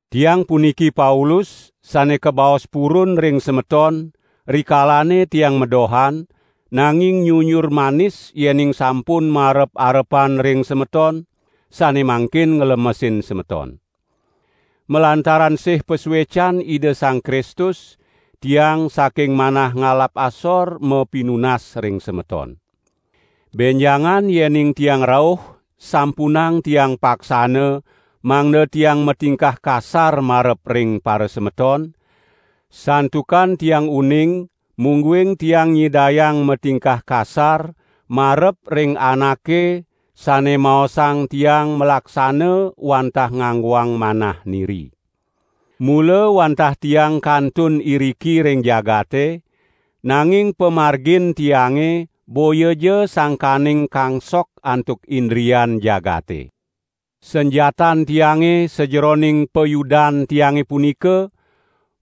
Tiang puniki Paulus, sane kabaos purun ring semeton, rikalane tiang madohan, nanging nyunyur manis yening sampun marep-arepan ring semeton, sane mangkin nglemesin semeton. Malantaran sih pasuecan Ida Sang Kristus tiang saking manah ngalap asor mapinunas ring semeton. Benjangan yening tiang rauh sampunang tiang paksana mangda tiang matingkah kasar marep ring parasemeton, santukan tiang uning mungguing tiang nyidayang matingkah kasar marep ring anake sane maosang tiang malaksana wantah nganggoang manah niri. Mula wantah tiang kantun iriki ring jagate, nanging pamargin tiange boyaja sangkaning kangsok antuk indrian jagate. Sanjatan tiange sajeroning payudan tiange punika,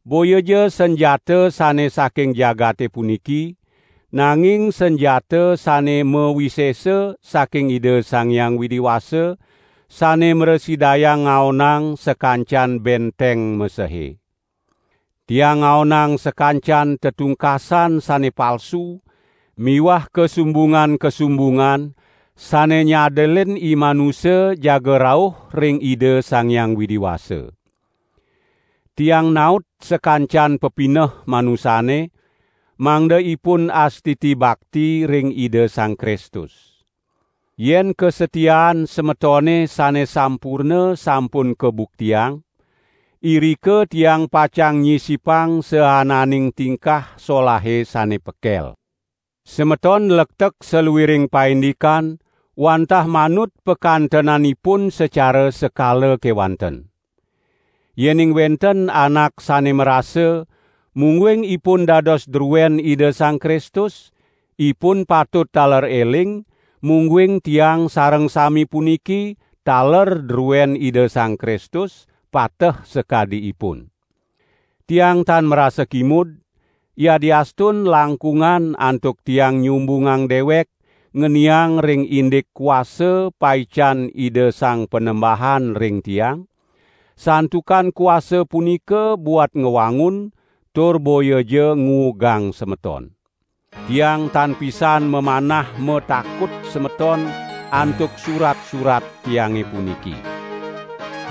boyaja sanjata sane saking jagate puniki, nanging sanjata sane mawisesa saking Ida Sang Hyang Widi Wasa, sane mrasidayang ngaonang sakancan benteng mesehe. Tiang ngaonang sakancan tetungkasan sane palsu miwah kasumbungan-kasumbungan sane nyadelin imanusa jaga rauh ring Ida Sang Hyang Widi Wasa. Tiang naut sakancan pepineh manusane, mangda ipun astiti bakti ring Ida Sang Kristus. Yen kasatiaan semetone sane sampurna sampun kabuktiang, irika tiang pacang nyisipang saananing tingkah solahe sane pekel. Semeton nlektek saluiring paindikan, wantah manut pakantenanipun sacara sekala kewanten. Yening wenten anak sane marasa, mungguing ipun dados druen Ida Sang Kristus, ipun patut taler eling mungguing tiang sareng sami puniki, taler druen Ida Sang Kristus, pateh sakadi ipun. Tiang tan marasa kimud, yadiastun langkungan antuk tiang nyumbungang dewek ngeniang ring indik kuasa paican Ida Sang Panembahan ring tiang, santukan kuasa punika buat ngwangun, tur boyaja nguugang semeton. Tiang tan pisan mamanah matakut semeton antuk surat-surat tiange puniki.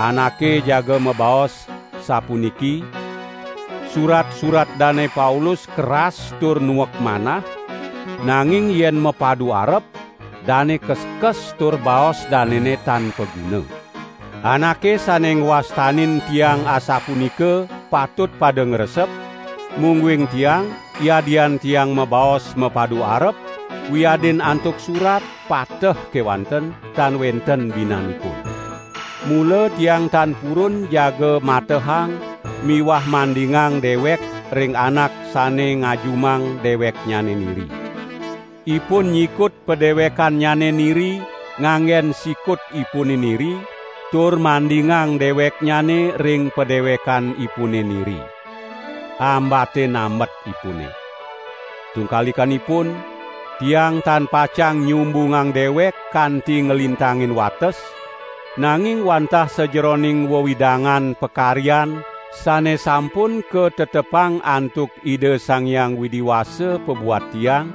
Anake jaga mabaos sapuniki: "Surat-surat Dane Paulus keras tur nuek manah, nanging yen mapadu arep, dane keskes tur baos danene tan paguna." Anake sane ngwastanin tiang asapunika patut pada ngresep, mungguing tiang yadian tiang mabaos mapadu arep, wiadin antuk surat, pateh kewanten, tan wenten binanipun. Mula tiang tan purun jaga matehang miwah mandingang dewek ring anak sane ngajumang deweknyane niri. Ipun nyikut padewekannyane niri nganggen sikutipune niri tur mandingang deweknyane ring padewekanipune niri. Ambate nambetipune! Tungkalikanipun, tiang tan pacang nyumbungang dewek kanti nglintangin wates, nanging wantah sajeroning wewidangan pakaryan sane sampun katetepang antuk Ida Sang Hyang Widi Wasa pabuat tiang,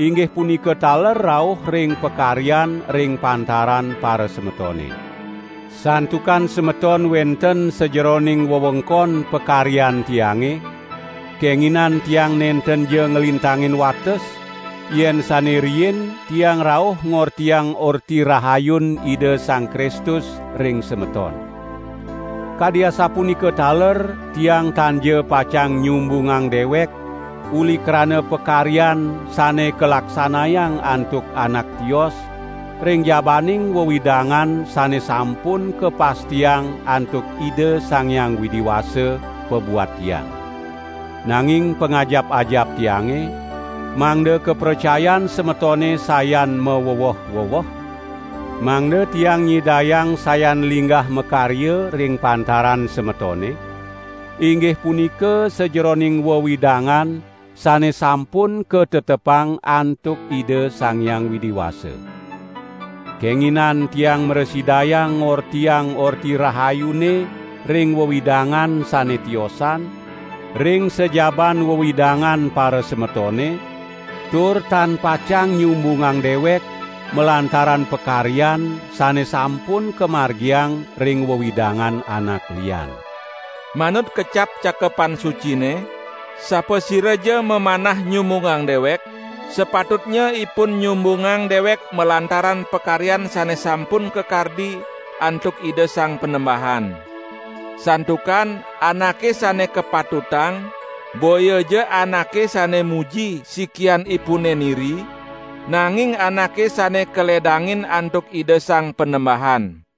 inggih punika taler rauh ring pakaryan ring pantaran parasemetone. Santukan semeton wenten sajeroning wewengkon pakaryan tiange, kenginan tiang nentenja nglintangin wates, yen sane riin tiang rauh ngortiang Orti Rahayun Ida Sang Kristus ring semeton. Kadi asapunika taler tiang tanja pacang nyumbungang dewek uli krana pakaryan sane kalaksanayang antuk anak tios ring jabaning wewidangan sane sampun kapastiang antuk Ida Sang Hyang Widi Wasa pabuat tiang. Nanging pangajap-ajap tiange, mangda kapracayan semetone sayan maweweh-weweh, mangda tiang nyidayang sayan linggah makarya ring pantaran semetone, inggih punika sajeroning wewidangan sane sampun katetepang antuk Ida Sang Hyang Widi Wasa. Kenginan tiang mrasidayang ngortiang Orti Rahayune ring wewidangan sane tiosan, ring sajaban wewidangan parasemetone, tur tan pacang nyumbungang dewek malantaran pakaryan sane sampun kamargiang ring wewidangan anak lian. Manut kecap Cakepan Sucine: "Sapasiraja mamanah nyumbungang dewek, sapatutnya ipun nyumbungang dewek malantaran pakaryan sane sampun kakardi antuk Ida Sang Panembahan." Santukan anake sane kapatutang boyaja anake sane muji sikianipune niri, nanging anake sane kaledangin antuk Ida Sang Panembahan.